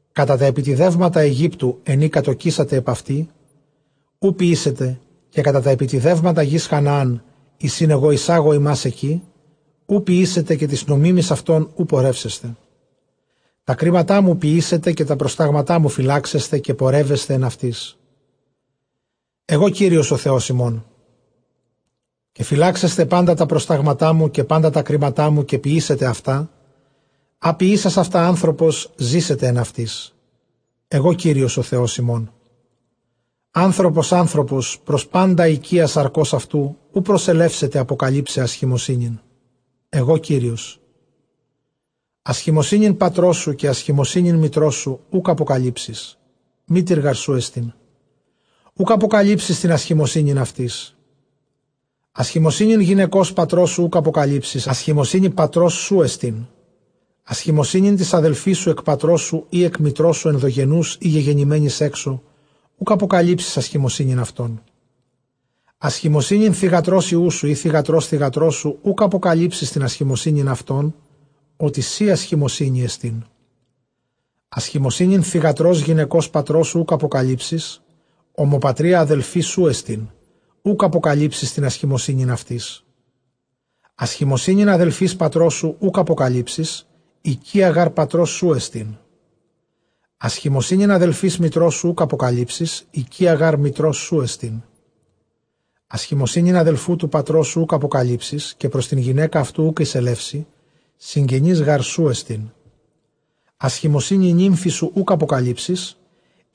Κατὰ τὰ ἐπιτηδεύματα Αἰγύπτου, ἐν ᾗ κατῳκήσατε ἐπʼ αὐτῇ, οὐ ποιήσετε· καὶ κατὰ τὰ ἐπιτηδεύματα γῆς Χαναὰν, εἰς ἣν ἐγὼ εἰσάγω ὑμᾶς ἐκεῖ, οὐ ποιήσετε, καὶ τοῖς νομίμοις αὐτῶν οὐ πορεύσεσθε. Τὰ κρίματά μου ποιήσετε, καὶ τὰ προστάγματά μου φυλάξεσθε, καὶ πορεύεσθε ἐν αὐτοῖς· ἐγὼ Κύριος ὁ Θεὸς ὑμῶν. Καὶ φυλάξεσθε πάντα τὰ προστάγματά μου, καὶ πάντα τὰ κρίματά μου, καὶ ποιήσετε αὐτά· ἃ ποιήσας αὐτὰ ἄνθρωπος, ζήσεται ἐν αὐτοῖς· ἐγὼ Κύριος ὁ Θεὸς ὑμῶν. Ἄνθρωπος ἄνθρωπος πρὸς πάντα οἰκεῖα σαρκὸς αὐτοῦ οὐ προσελεύσεται ἀποκαλύψαι ἀσχημοσύνην· ἐγὼ Κύριος. Ἀσχημοσύνην πατρός σου καὶ ἀσχημοσύνην μητρός σου οὐκ ἀποκαλύψεις, μήτηρ γάρ σου ἐστὶν, οὐκ ἀποκαλύψεις τὴν ἀσχημοσύνην αὐτῆς. Ἀσχημοσύνην γυναικὸς πατρός σου οὐκ ἀποκαλύψεις, ἀσχημοσύνη πατρός σου ἐστίν. Ἀσχημοσύνην τῆς ἀδελφῆς σου ἐκ πατρός σου ἢ ἐκ μητρός σου, ἐνδογενοῦς ἢ γεγεννημένης ἔξω, οὐκ ἀποκαλύψεις ἀσχημοσύνην αὐτῶν. Ἀσχημοσύνην θυγατρὸς υἱοῦ σου, ἢ θυγατρὸς θυγατρός σου, οὐκ ἀποκαλύψεις τὴν ἀσχημοσύνην αὐτῶν, ὅτι σὴ ἀσχημοσύνη ἐστίν. Ἀσχημοσύνην θυγατρὸς γυναικὸς πατρός σου οὐκ ἀποκαλύψεις, ὁμοπατρία ἀδελφή σου ἐστὶν, οὐκ ἀποκαλύψεις τὴν ἀσχημοσύνην αὐτῆς. Ἀσχημοσύνην ἀδελφῆς πατρός σου οὐκ ἀποκαλύψεις, οἰκεία γὰρ πατρός σου ἐστιν. Ἀσχημοσύνην ἀδελφῆς μητρός σου οὐκ ἀποκαλύψεις, οἰκεία γὰρ μητρός σου ἐστίν. Ἀσχημοσύνην ἀδελφοῦ τοῦ πατρός σου οὐκ ἀποκαλύψεις, καὶ πρὸς τὴν γυναῖκα αὐτοῦ οὐκ εἰσελεύσῃ, συγγενὴς γάρ σου ἐστίν. Ἀσχημοσύνην νύμφης σου οὐκ ἀποκαλύψεις,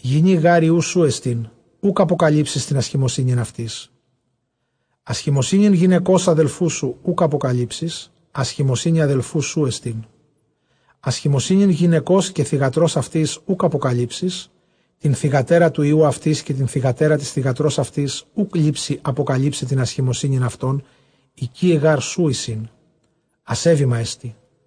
γυνὴ γὰρ υἱοῦ σου ἐστὶν, οὐκ ἀποκαλύψεις τὴν ἀσχημοσύνην αὐτῆς. Ἀσχημοσύνην γυναικὸς ἀδελφοῦ σου οὐκ ἀποκαλύψεις, ἀσχημοσύνη ἀδελφοῦ σου ἐστίν. Ἀσχημοσύνην γυναικὸς καὶ θυγατρὸς αὐτῆς οὐκ ἀποκαλύψεις· τὴν θυγατέρα τοῦ υἱοῦ αὐτῆς, καὶ τὴν θυγατέρα τῆς θυγατρὸς αὐτῆς οὐ λήψῃ ἀποκαλύψαι τὴν ἀσχημοσύνην αὐτῶν, οἰκεῖαι γάρ σου εἰσίν· ἀσέβημα ἐστι.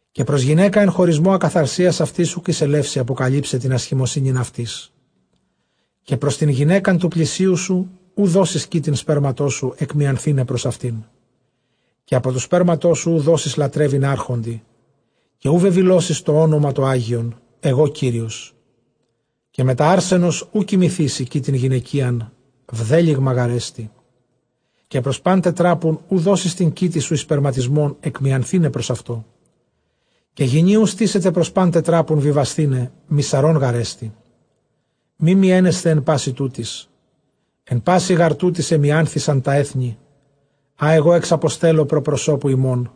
Καὶ πρὸς γυναῖκα ἐν χωρισμῷ ἀκαθαρσίας αὐτῆς οὐκ εἰσελεύσῃ ἀποκαλύψαι τὴν ἀσχημοσύνην αὐτῆς. Καὶ πρὸς τὴν γυναῖκα τοῦ πλησίον σου οὐ δώσεις κοίτην σπέρματός σου, ἐκμιανθῆναι πρὸς αὐτήν. Καὶ ἀπὸ τοῦ σπέρματός σου οὐ δώσεις λατρεύειν ἄρχοντι· καὶ οὐ βεβηλώσεις τὸ ὄνομα τὸ ἅγιον· ἐγὼ Κύριος. Καὶ μετὰ ἄρσενος οὐ κοιμηθήσῃ κοίτην γυναικείαν, βδέλυγμα γάρ ἐστι. Καὶ πρὸς πᾶν τετράπουν οὐ δώσεις τὴν κοίτην σου εἰς σπερματισμὸν, ἐκμιανθῆναι πρὸς αὐτό· καὶ γυνὴ οὐ στήσεται πρὸς πᾶν τετράπουν βιβασθῆναι· μυσαρὸν γάρ ἐστι. Μὴ μιαίνεσθε ἐν πᾶσι τούτοις· ἐν πᾶσι γὰρ τούτοις ἐμίανθησαν τὰ ἔθνη, ἃ ἐγὼ ἐξαποστέλλω πρὸ προσώπου ὑμῶν,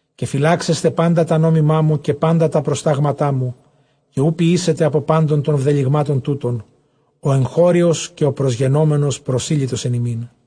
Καὶ φυλάξεσθε πάντα τὰ νόμιμά μου, καὶ πάντα τὰ προστάγματά μου, καὶ οὐ ποιήσετε ἀπὸ πάντων τῶν βδελυγμάτων τούτων ὁ ἐγχώριος, καὶ ὁ προσγενόμενος προσήλυτος ἐν ὑμῖν·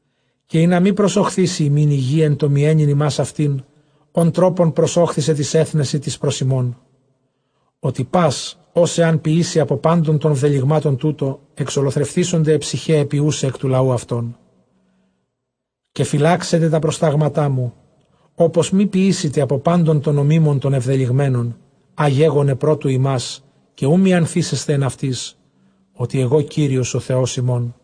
καὶ ἵνα μὴ προσοχθίσῃ ὑμῖν ἡ γῆ ἐν τῷ μιαίνειν ὑμᾶς αὐτὴν, ὃν τρόπον προσώχθισε τοῖς ἔθνεσι τοῖς πρὸ ὑμῶν. Ὅτι πᾶς ὃς ἐὰν ποιήσῃ ἀπὸ πάντων τῶν βδελυγμάτων τούτων, ἐξολοθρευθήσονται αἱ ψυχαὶ αἱ ποιοῦσαι ἐκ τοῦ λαοῦ αὐτῶν. Καὶ φυλάξετε τὰ προστάγματά μου, ὅπως μὴ ποιήσητε ἀπὸ πάντων τῶν νομίμων τῶν ἐβδελυγμένων, ἃ γέγονε πρὸ τοῦ ὑμᾶς· καὶ οὐ μιανθήσεσθε ἐν αὐτοῖς, ὅτι ἐγὼ Κύριος ὁ Θεὸς ὑμῶν.